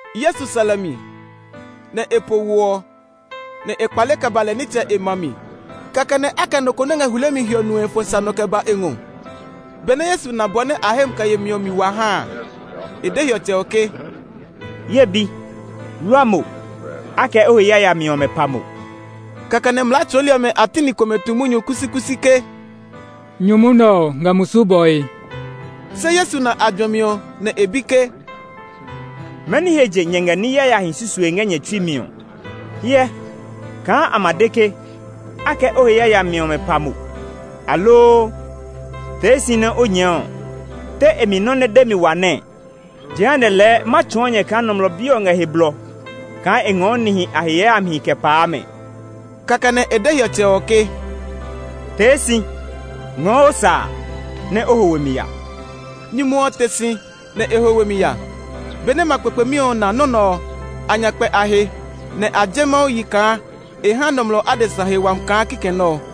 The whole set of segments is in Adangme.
Yesu sɛ lɛ mi, nɛ e po wo ɔ, nɛ e kpale kɛ ba lɛ nitsɛ e ma mi. Kɛkɛ nɛ a kɛ nɔ ko nɛ ngɛ hulemi hiɔ nue fɔ sa nɔ kɛ ba e ngɔ. Benɛ Yesu na bɔ nɛ a hemi kɛ yemi ɔ mi wa ha a, e de hiɔtsɛ ɔ ke, “Ye bi, wlua mo! A kɛ o he yayami ɔmɛ pa mo.” Kɛkɛ nɛ mlaa tsɔɔli ɔmɛ a ti ni komɛ tu munyu kusikusi ke, “Nyumu nɛ ɔ ngɛ musu bɔe.” Se Yesu na a juɛmi ɔ, nɛ e bi ke, “Mɛni he je nyɛ ngɛ ní yayahi susue ngɛ nyɛ tsui mi ɔ? Hyɛ, kaa a ma de ke, ‘A kɛ o he yayami ɔmɛ pa mo’, aloo, ‘Tee si nɛ o nyɛɛ’ ɔ, te e mi nɔ́ nɛ demi wa nɛɛ? Jehanɛ lɛɛ ma tsɔɔ nyɛ kaa Nɔmlɔ Bi ɔ ngɛ he blɔ kaa e ngɔɔ nihi a he yayamihi kɛ paa mɛ.” Kɛkɛ nɛ e de hiɔtsɛ ɔ ke, “Tee si, ngɔɔ o sa a, nɛ o ho we mi ya!” Nyumu ɔ te si, nɛ e ho we mi ya. Benɛ ma kpekpemi ɔ na nɔ́ nɛ ɔ, a nya kpɛ a he, nɛ a je Mawu yi kaa e ha nɔmlɔ adesa he wami kaa kikɛ nɛ ɔ.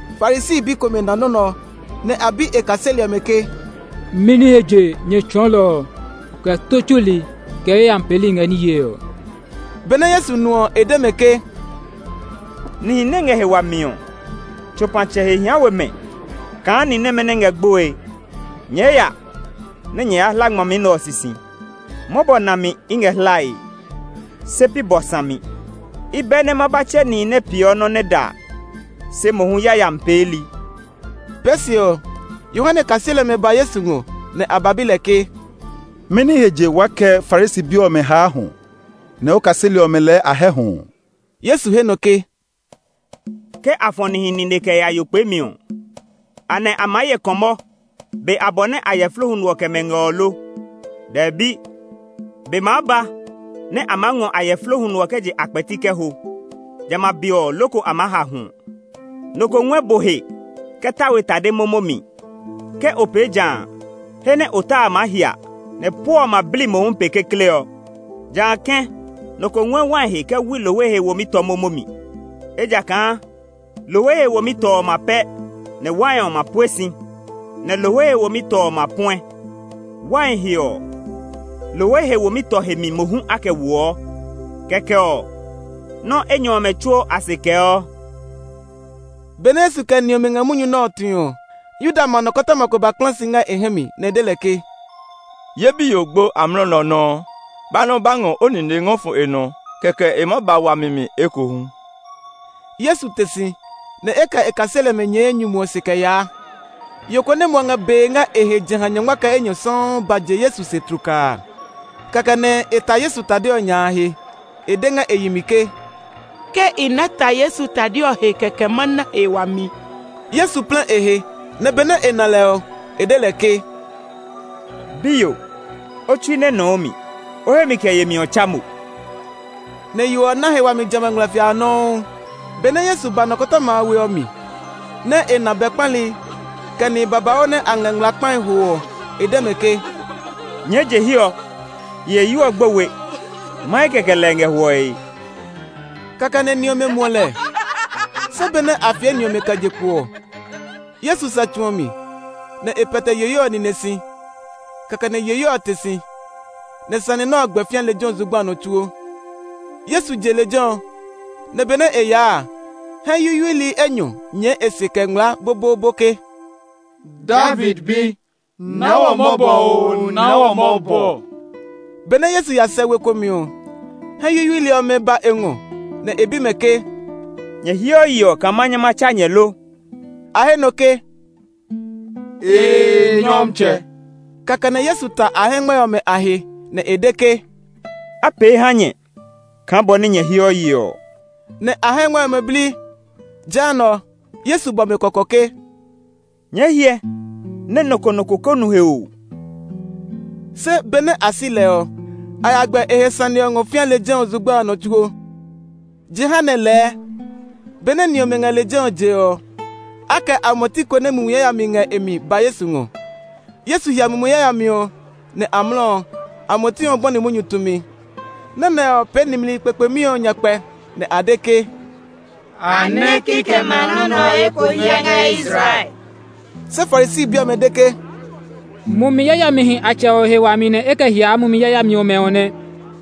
Farisi bi komɛ na nɔ́ nɛ ɔ, nɛ a bi e kaseli ɔmɛ ke, “Mɛni he je nyɛ tsɔɔlɔ ɔ, kɛ tó tsuli, kɛ yayami peeli ngɛ ní yee ɔ?” Benɛ Yesu nu ɔ, e de mɛ ke, “Nihi nɛ ngɛ he wami ɔ, tsopatsɛ he hia we mɛ kaa ni nɛmɛ nɛ ngɛ gboe. Nyɛɛ ya nɛ nyɛ ya hla ngmami nɛ ɔ sisi: ‘Mɔbɔ nami i ngɛ hlae, se pi bɔ sami!’ I bɛ nɛ ma ba tsɛ nihi nɛ peeɔ nɔ́ nɛ da, se mohu yayami peeli.” Pee se ɔ, Yohane kaseli ɔmɛ ba Yesu ngɔ, nɛ a ba bi lɛ ke, “Mɛni he je waa kɛ Farisi bi ɔmɛ haa hwɔ, nɛ o kaseli ɔmɛ lɛɛ a hɛ hwɔ ɔ?” Yesu he nɔ ke, “Ke a fɔ̃ nihi nine kɛ ya yo kpeemi ɔ, anɛ a maa ye kɔmɔ be abɔ nɛ ayɛflo huno ɔ kɛ mɛ ngɛ ɔ lo? Dɛbi! Be maa ba nɛ a maa ngɔ ayɛflo huno ɔ kɛ je a kpɛti kɛ ho; jamɛ a be ɔ loko a maa ha hwɔ. “Nɔ ko ngɔɛ bo he kɛ ta we tade momo mi. Ke o pee jã a, he nɛ o ta a ma hía, nɛ puɔ ɔ ma bli mohu pe kekle ɔ. Jã kɛ̃, nɔ ko ngɔɛ wai he kɛ wui lohwe he womi tɔ momo mi. Ejakaa lohwe he womi tɔ ɔ ma pɛ, nɛ wai ɔ ma pue si, nɛ lohwe he womi tɔ ɔ ma puɛ. Wai he ɔ, lohwe he womi tɔ he mi mohu a kɛ woɔ. Kɛkɛ ɔ, nɔ́ enyɔ ɔmɛ tsuo a se kɛɔ.” Benɛ Yesu kɛ ni ɔmɛ ngɛ munyu nɛ ɔ tue ɔ, Yuda ma nɔkɔtɔma ko ba ba kpla si ngɛ e hɛ mi, nɛ e de lɛ ke, “Ye biyo gbo amlɔ nɛ ɔ nɔuu; ba nɛ o ba ngɔ o nine ngɔ fɔ e nɔ, kɛkɛ e maa ba wami mi ekohu.” Yesu te si, nɛ e kɛ e kaseli ɔmɛ nyɛɛ nyumu ɔ se kɛ yaa. Yo ko nɛ muɔ ngɛ bee ngɛ e he jeha nyɔngma kɛ enyɔ sɔuu ba je Yesu se tlukaa. Kɛkɛ nɛ e ta Yesu tade ɔ nya a he. E de ngɛ e yi mi ke, “Ke i ná ta Yesu tade ɔ he kɛkɛ ma na he wami.” Yesu plɛ e he, nɛ benɛ e na lɛ ɔ, e de lɛ ke, “Biyo, o tsui nɛ nɔ o mi; o hemi kɛ yemi ɔ tsa mo.” Nɛ yo ɔ na he wami jamɛ a ngmlɛfia a nɔuu. Benɛ Yesu ba nɔkɔtɔma a we ɔ mi, nɛ e na bɛ kpali, kɛ nihi babauu nɛ a ngɛ ngmlaa kpae hoo ɔ, e de mɛ ke, “Nyɛɛ je hiɛ ɔ! Yiheyo ɔ gbo we; mahe kɛkɛ lɛ e ngɛ hwɔe.” Kɛkɛ nɛ ni ɔmɛ muɔ lɛ. Se benɛ a fie ni ɔmɛ kɛ je kpo ɔ, Yesu sɛ tsu ɔ mi, nɛ e pɛtɛ yiheyo ɔ nine si. Kɛkɛ nɛ yiheyo ɔ te si. Nɛ sane nɛ ɔ gbɛ fĩa lejɛ ɔ zugba a nɔ tsuo. Yesu je lejɛ ɔ, nɛ benɛ e yaa a, hɛ yuyuili enyɔ nyɛɛ e se kɛ ngmlaa boboobo ke, “David Bi, naa wɔ mɔbɔ oo naa wɔ mɔbɔ!” Benɛ Yesu ya sɛ we ko mi ɔ, hɛ yuyuili ɔmɛ ba e ngɔ, nɛ e bi mɛ ke, “Nyɛ heɔ yeɔ kaa ma nyɛ ma tsa nyɛ lo?” A he nɔ ke, “Ee, Nyɔmtsɛ!” Kɛkɛ nɛ Yesu ta a hɛngmɛ ɔmɛ a he, nɛ e de ke, “A pee ha nyɛ kaa bɔ nɛ nyɛ heɔ yeɔ ɔ!” Nɛ a hɛngmɛ ɔmɛ bli. Jehanɛ, Yesu bɔ mɛ kɔkɔ ke, “Nyɛɛ hyɛ nɛ nɔ ko nɔ ko ko nu he oo!” Se benɛ a si lɛ ɔ, a ya gbɛ e he sane ɔ ngɔ fĩa lejɛ ɔ zugba a nɔ tsuo. Jehanɛ lɛɛ, benɛ ni ɔmɛ ngɛ lejɛ ɔ jee ɔ, a kɛ amuɛti ko nɛ mumi yayami ngɛ e mi ba Yesu ngɔ. Yesu hia mumi yayami ɔ, nɛ amlɔ ɔ, amuɛti ɔ bɔni munyu tumi. Nɔ́ nɛ ɔ pee nimli kpekpemi ɔ nyakpɛ, nɛ a de ke, “A nɛ kikɛmɛ a nɔ́ nɛ ɔ eko hyɛ ngɛ Israel!” Se Farisi bi ɔmɛ de ke, “Mumi yayamihi a tsɛ ɔ he wami nɛ e kɛ hiaa mumi yayami ɔmɛ ɔ nɛ.”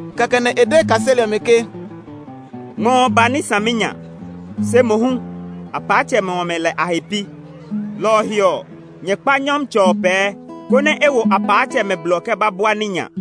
Kɛkɛ nɛ e de e kaseli ɔmɛ ke, “Ngmɔ ɔ ba ní saminya; se mohu apaatsɛmɛ ɔmɛ lɛ a he pi. Lɔ ɔ he ɔ, nyɛ kpa ngmɔtsɛ ɔ pɛɛ, konɛ e wo apaatsɛmɛ blɔ kɛ ba bua ní nya.”